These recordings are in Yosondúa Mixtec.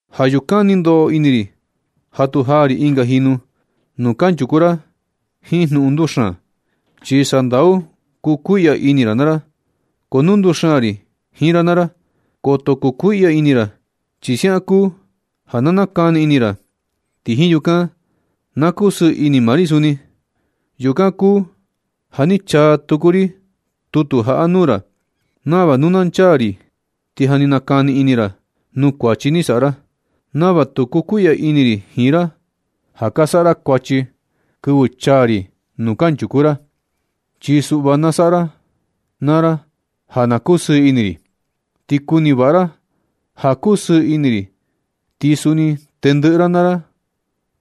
Ja yukan ni ndoꞌo ini ri ja tu jaa ri ɨnga jinu nuu kanchuku ra jiin jnuꞌun nduxaan, chi sandau kukuiꞌya ini ra naa ra. Ko nu nduxaan ri jiin ra naa ra, koto kukuiꞌya ini ra, chi siaꞌan kuu ja na nakani ini ra. Ti jiin yukan na kusɨɨ ini maa ri suni. Yukan kuu ja ni chaa tuku ri tutu jaꞌa nuu ra, nava nu na chaa ri ti ja ni nakani ini ra nuu kuachi ni saꞌa ra, nava tu kukuiꞌya ini ri jiin ra ja ka saꞌa ra kuachi kɨvɨ chaa ri nuu kanchuku ra. Chi suꞌva na saꞌa ra naa ra ja na kusɨɨ ini ri. Ti kuni vaꞌa ra ja nu kusɨɨ ini ri, ti suni tendɨꞌɨ ra na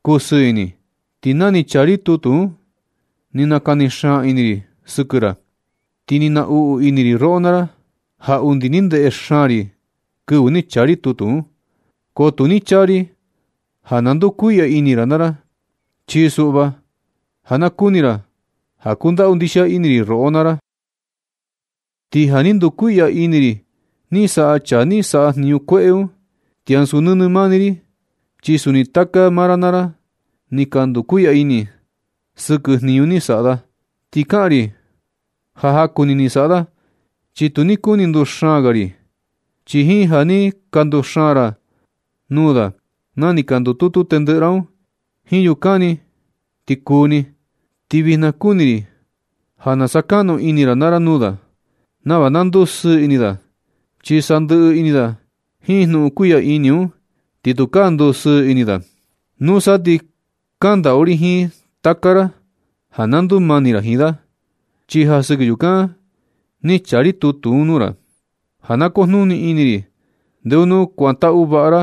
kusɨɨ ini. Ti na ni chaa ri tutu un, ni nakani xaan ini ri sɨkɨ ra, ti ni naꞌnu ini ri roꞌo naa ra, ja undi ni ndeꞌe xaan ri kɨvɨ ni chaa ri tutu un. Ko tu ni chaa ri ja na kukuiꞌya ini ra naa ra, chi suꞌva ja na kuni ra ja kundaꞌu ndixia ini ri roꞌo naa ra. Ti ja ni ndukuiꞌya ini ri ni saꞌa chaa ja ni saꞌa jniñu kueꞌe un, ti ansu nɨnɨ mani ri, chi suni taka maa ra naa ra ni ka ndukuiꞌya ini sɨkɨ jniñu ni saꞌa da. Ti kaꞌan ri ja jaku ni ni saꞌa da, chi tu ni kuni ri ja nduxaan ga ri. Chi jiin ja ni ka nduxaan ra nuu da na ni ka ndututu tendɨꞌɨ ra un, jiin yukan ti ni kuu ni. Ti vijna kuni ri ja na sakaꞌnu ini ra naa ra nuu da, nava na ndusɨɨ ini da, chi sandɨꞌɨ ini da jiin jnuꞌun kuiꞌya ini un, ti tukaa ndusɨɨ ini da. Nusa ti kaꞌan ndaꞌu ri jiin taka ra ja na ndumani ra jiin da. Chi ja sɨkɨ yukan ni chaa ri tutu un nuu ra, ja na kujnuni ini ri ndeo nu kuantaꞌu vaꞌa ra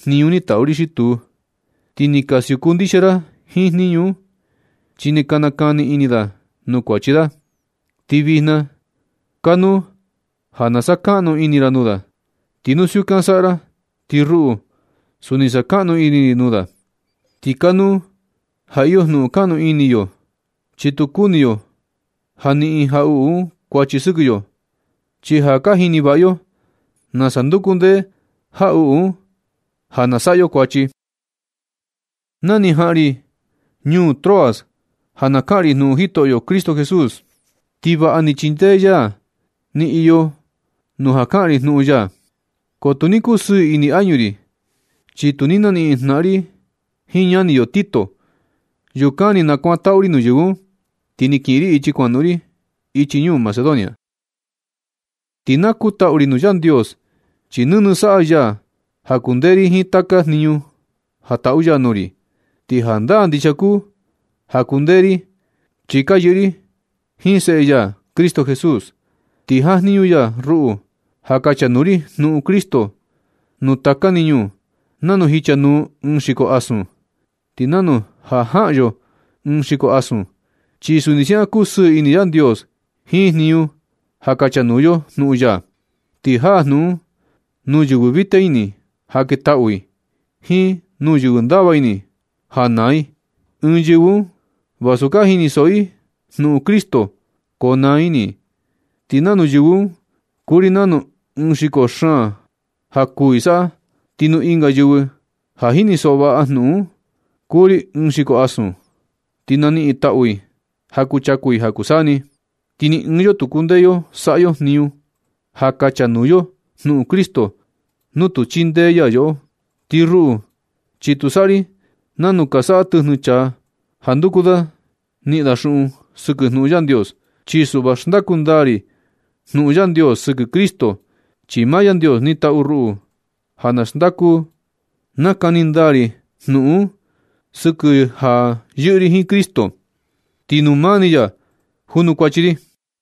jniñu ni taꞌu ri xi tuu. Ti ni ka siuku ndixia ra jiin jniñu un. Chi ni nakani ini da nuu kuachi da. Ti vijna kanuu ja na sakaꞌnu ini ra nuu da. Ti nu siukan na saꞌa ra, ti ruꞌu, suni sakaꞌnu ini ri nuu da. Ti kanuu ja iyo jnuꞌun kaꞌnu ini yo, chi tu kuni yo ja niꞌin jaꞌuꞌu un kuachi sɨkɨ yo, chi ja ka jini vaꞌa yo nasa nduku ndee jaꞌuꞌu un ja na saꞌa yo kuachi. Na ni jaꞌan ri ñuu Troas ja na kaꞌan ri jnuꞌun Jitoꞌyo Cristo Jesús, ti vaꞌa ni chindee ya ja ni iyo nuu ja kaꞌan ri jnuꞌun ya. Ko tu ni kusɨɨ ini añu ri, chi tu ni naniꞌin jnaꞌan ri jiin ñani yo Tito. Yukan ni nakuantaꞌu ri nuu yɨvɨ un, ti ni kiꞌin ri ichi kuanoꞌon ri ichi ñuu Macedonia. Ti na kutaꞌu ri nuu Yandios, chi nɨnɨ saꞌa ya ja kundee ri jiin taka jniñu ja taꞌu ya nuu ri. Ti jandaa ndixia kuu ja ka kundee ri, chi ka yɨꞌɨ ri jiin seꞌe ya Cristo Jesús. Ti jajniñu ya ruꞌu ja kachanuu ri jnuꞌun Cristo nuu taka ni ñuu, nanu jichanuu ɨɨn xiko asun. Ti nanu ja jaꞌan yo ɨɨn xiko asun, chi suni siaꞌan kusɨɨ ini Yandios jiin jniñu ja jachanuu yo jnuꞌun ya, ti jaa jnuꞌun un nuu yɨvɨ vita ini ja ketaꞌu i, jiin nuu yɨvɨ ndava ini ja naa i. Ɨɨn yɨvɨ un, vasu ka jinisoꞌo i jnuꞌun Cristo, ko naa ini i. Ti nuu yɨvɨ un kuu ri nanu ɨɨn xiko xaan ja kuū i saꞌa. Ti nuu ɨnga yɨvɨ ja jinisoꞌo vaꞌa jnuꞌun un, kuu ri ɨɨn xiko asun, chi ni naniꞌin i taꞌu i ja kuchaku i ja kuu saa ni. Ti ni ɨɨn yo tu kundee yo saꞌa yo jniñu ja kachanuu yo jnuꞌun Cristo nu tu chindee ya yoꞌo. Ti ruꞌu, chi tu saꞌa ri nanu ka saꞌa tɨjnɨ chaa ja nduku da niꞌin da xuꞌun sɨkɨ jnuꞌun Yandios. Chi suꞌva xndaku ndaa ri jnuꞌun Yandios sɨkɨ Cristo, chi maa Yandios ni tatu ruꞌu ja na xndaku nakani ndaa ri jnuꞌun un sɨkɨ ja yɨꞌɨ ri jiin Cristo, ti nuu mani maa ya junukuachi ri.